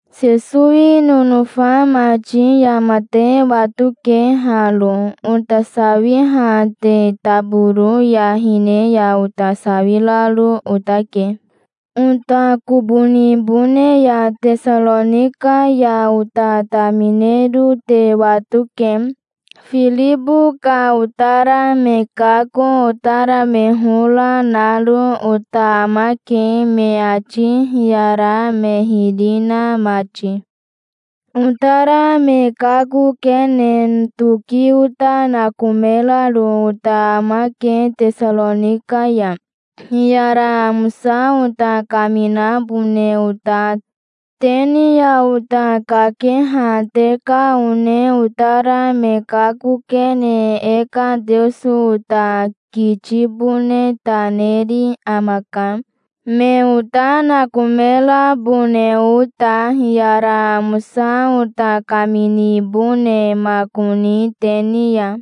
Sesowi nonofa mati yama te watoke haro: ota sawiha te taboro ya hine ya ota sawiraro otake. Ota kobo nibone ya Tesaronika ya ota taminero te watoke. Firibo ka otara me kako, otara me hora, naro ota amake, me ati hiyara me hiri na mati. Otara me kakokene toki ota nakomeraro ota amake Tesaronika ya, hiyara amosa ota kaminabone ota te ni ya. Te ni ya ota kakeha te ka one otara me kakokene e ka Teoso ota kitibone ta neri amaka, me ota nakomerabone ota, hiyara amosa ota kaminibonemakoni te ni ya.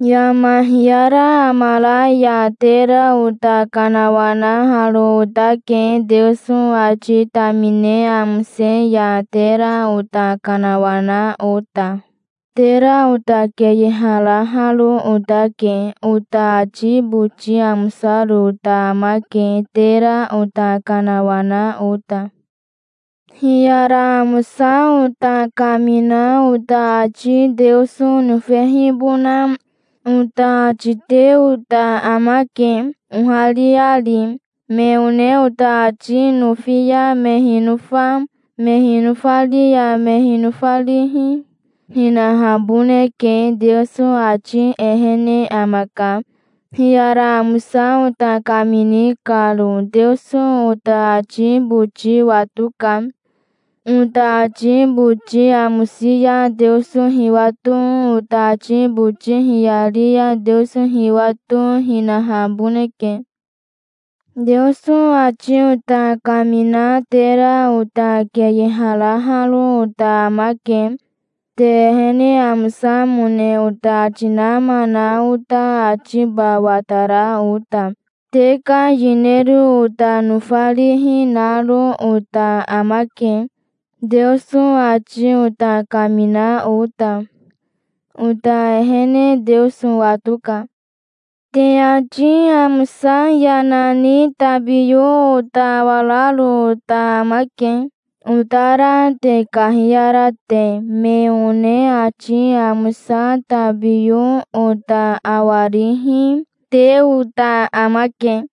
Yama hiyara amara ya tera ota kanawanaharo otake, Teoso ati tamine amose ya tera ota kanawana ota. Tera ota keyeharaharo otake. Ota ati boti amosaro ota amake, tera ota kanawana ota. Hiyara amosa ota kamina ota ati Teoso nofehibona ota ati te ota amake, ohariari. Me one ota ati nofi ya me hinofa, me hinofari ya me hinofarihi, hinahaboneke. Teoso ati ehene amaka, hiyara amosa ota kamini karo. Teoso ota ati boti watoka. Ota ati boti amosi ya Teoso hiwato, ota ati boti hiyari ya Teoso hiwato, hinahaboneke. Teoso ati ota kamina tera ota keyeharaharo ota amake, te ehene amosamone ota ati nama na ota atiba watara ota. Te ka yinero ota nofarihi naro ota amake, Teoso ati ota kamina ota. Ota ehene Teoso watoka. Te ati amosa yana ni tabiyo ota awararo ota amake, otara te kahiyara te. Me one ati amosa tabiyo ota awarihi, te ota amake.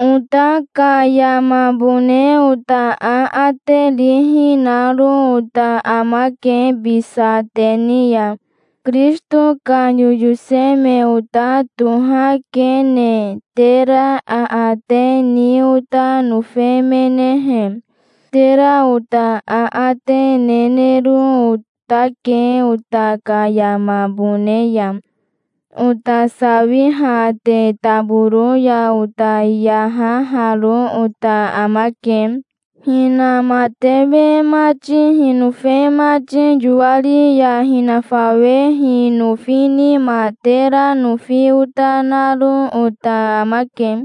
Ota ka yamabone ota aate rihi naro ota amake bisa te ni ya, Kirisito ka yoyose me ota tohakene. Tera aate ni ota nofemenehe, tera ota aate nenero otake ota ka yamabone ya. Ota sawiha te taboro ya ota yahaharo ota amake. Hinamatewe mati hinofe mati yoari ya hinafawehi nofi nima tera nofi ota naro ota amake.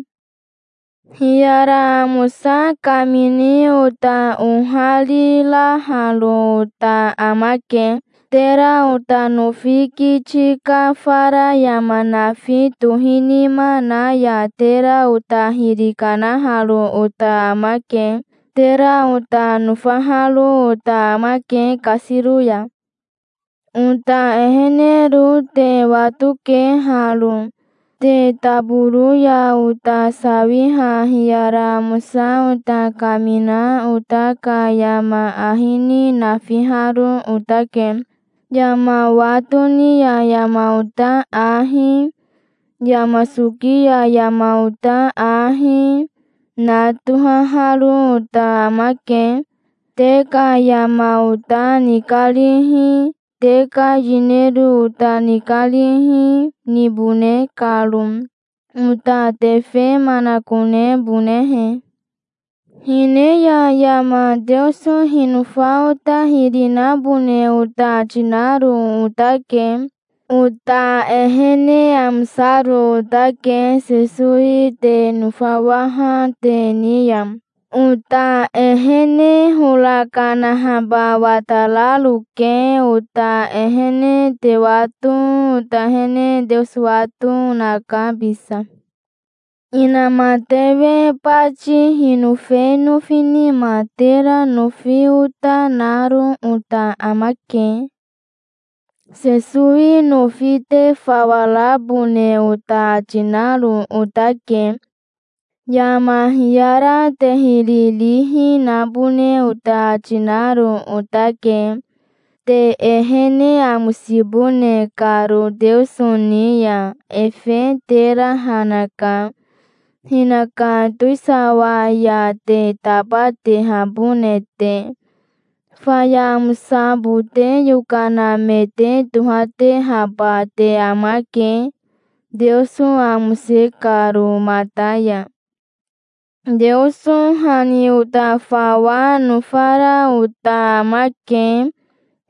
Hiyara amosa kamini ota ohariraharo ota amake. Tera ota nofi kiti ka fara yama nafi tohinima na ya tera ota hiri kanaharo ota amake. Tera ota nofaharo ota amake kasiro ya. Ota ehenero te watoke haro. Te taboro ya ota sawiha hiyara amosa ota kamina ota ka yama ahi ni nafiharo otake. Yama wa toni ya yama ota ahi, yama soki ya yama ota ahi, na tohaharo ota amake, te ka yama ota nikarihi, te ka yinero ota nikarihi, nibone karo, ota tefe manakonebonehe. Hine ya yama Teoso hinofa ota hiri nabone ota ati naro otake. Ota ehene amosaro otake Sesowi te nofawaha te ni ya. Ota ehene hora kanahaba watararoke. Ota ehene te wato, ota ehene Teoso wato, naka bisa. Inamatewe bati hinofe nofi nima tera nofi ota naro ota amake. Sesowi nofi te fawa rabone ota ati naro otake. Yama hiyara te hiri rihi nabone ota ati naro otake, te ehene amosibone karo Teoso ni ya. Efe tera ha naka, hinaka towisawa ya te tabatehabone te. Faya amosabote yokana me te tohatehaba te amake, Teoso amose karo mata ya. Teoso ha ni ota fawa nofara ota amake,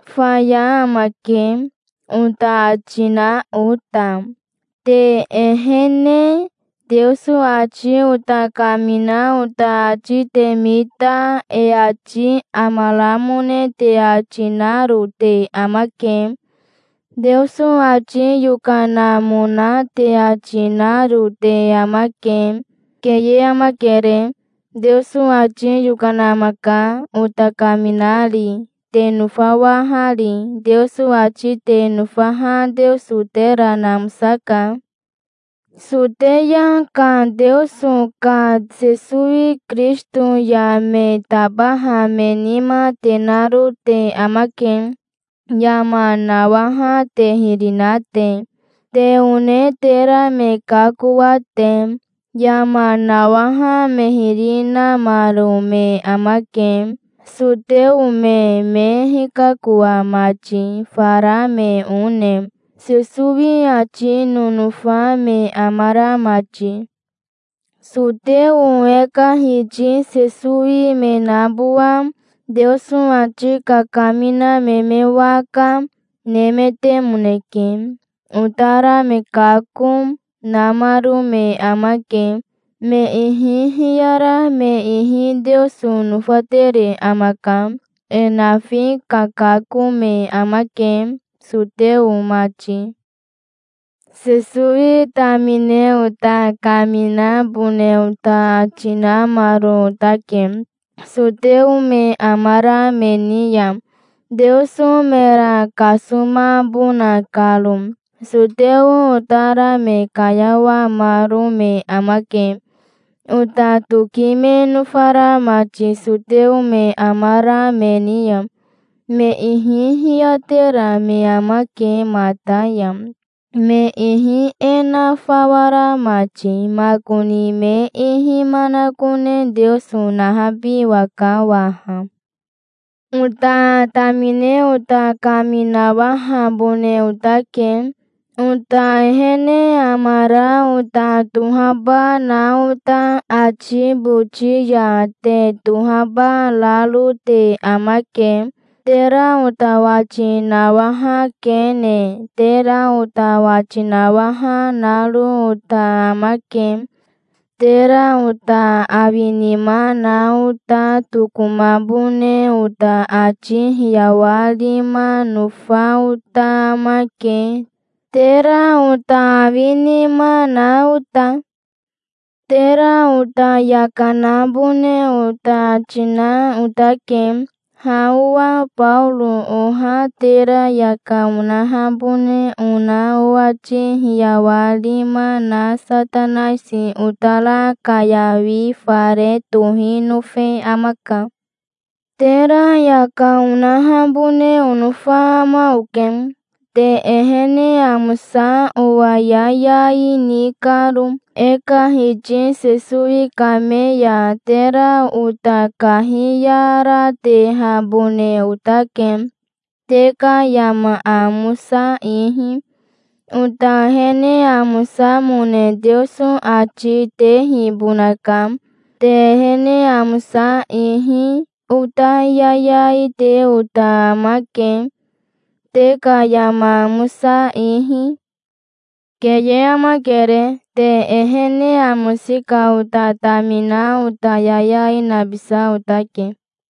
"Faya amake", ota ati na ota, te ehene. Teoso ati ota kamina ota ati te mita e ati amaramone te ati naro te amake. Teoso ati yokanamona te ati naro te amake. Keye amakere. Teoso ati yokana amaka, ota kaminari, te nofawahari. Teoso ati te nofaha Teoso tera namosaka. Soteya ka Teoso ka Sesowi Kirisito ya me tabaha me nima te naro te amake, yama nawaha te hiri na te, te one tera me kakoa te. Yama nawaha me hiri namaro me amake, soteo me me hikakoa mati, fara me one, Sesowi ati nonofa me amara mati. Soteo e ka Hiti Sesowi me nabowa, Teoso ati kakamina me me waka, nemetemoneke. Otara me kako, namaro me amake. Me ihi hiyara me ihi Teoso nofatere amaka. E nafi kakako me amake, soteo mati. Sesowi tamine ota kaminabone ota ati namaro otake, soteo me amara me ni ya, Teoso mera kasomabona karo. Soteo otara me kayawamaro me amake, ota toki me nofara mati soteo me amara me ni ya. Me ihi hiyatera me amake mata ya, me ihi e na fawa ra mati. Makoni me ihi manakone Teoso nahabiwaka waha. Ota tamine ota kaminawahabone otake. Ota ehene amara ota tohaba na ota ati boti ya te tohaba raro te amake. Tera ota wati nawahakene, tera ota wati nawaha naro ota amake. Tera ota awinima na ota tokomabone ota ati hiyawarima nofa ota amake, tera ota awinima na ota. Tera ota yaka nabone ota ati na otake. Ha owa Baoro oha tera yaka onahabone ona owati hiyawarima na Satanaisi otara kayawi fare tohi nofe amaka. Tera yaka onahabone onofa ama oke, te ehene amosa owa yayai ni karo. E ka Hiti Sesowi kame ya tera ota kahiyaratehabone otake, te ka yama amosa ihi. Ota ehene amosamone Teoso ati tehibonaka, te ehene amosa ihi. Ota yayai te ota amake, te ka yama amosa ihi. Keye amakere. Te ehene amosi ka ota tamina ota yayai nabisa otake.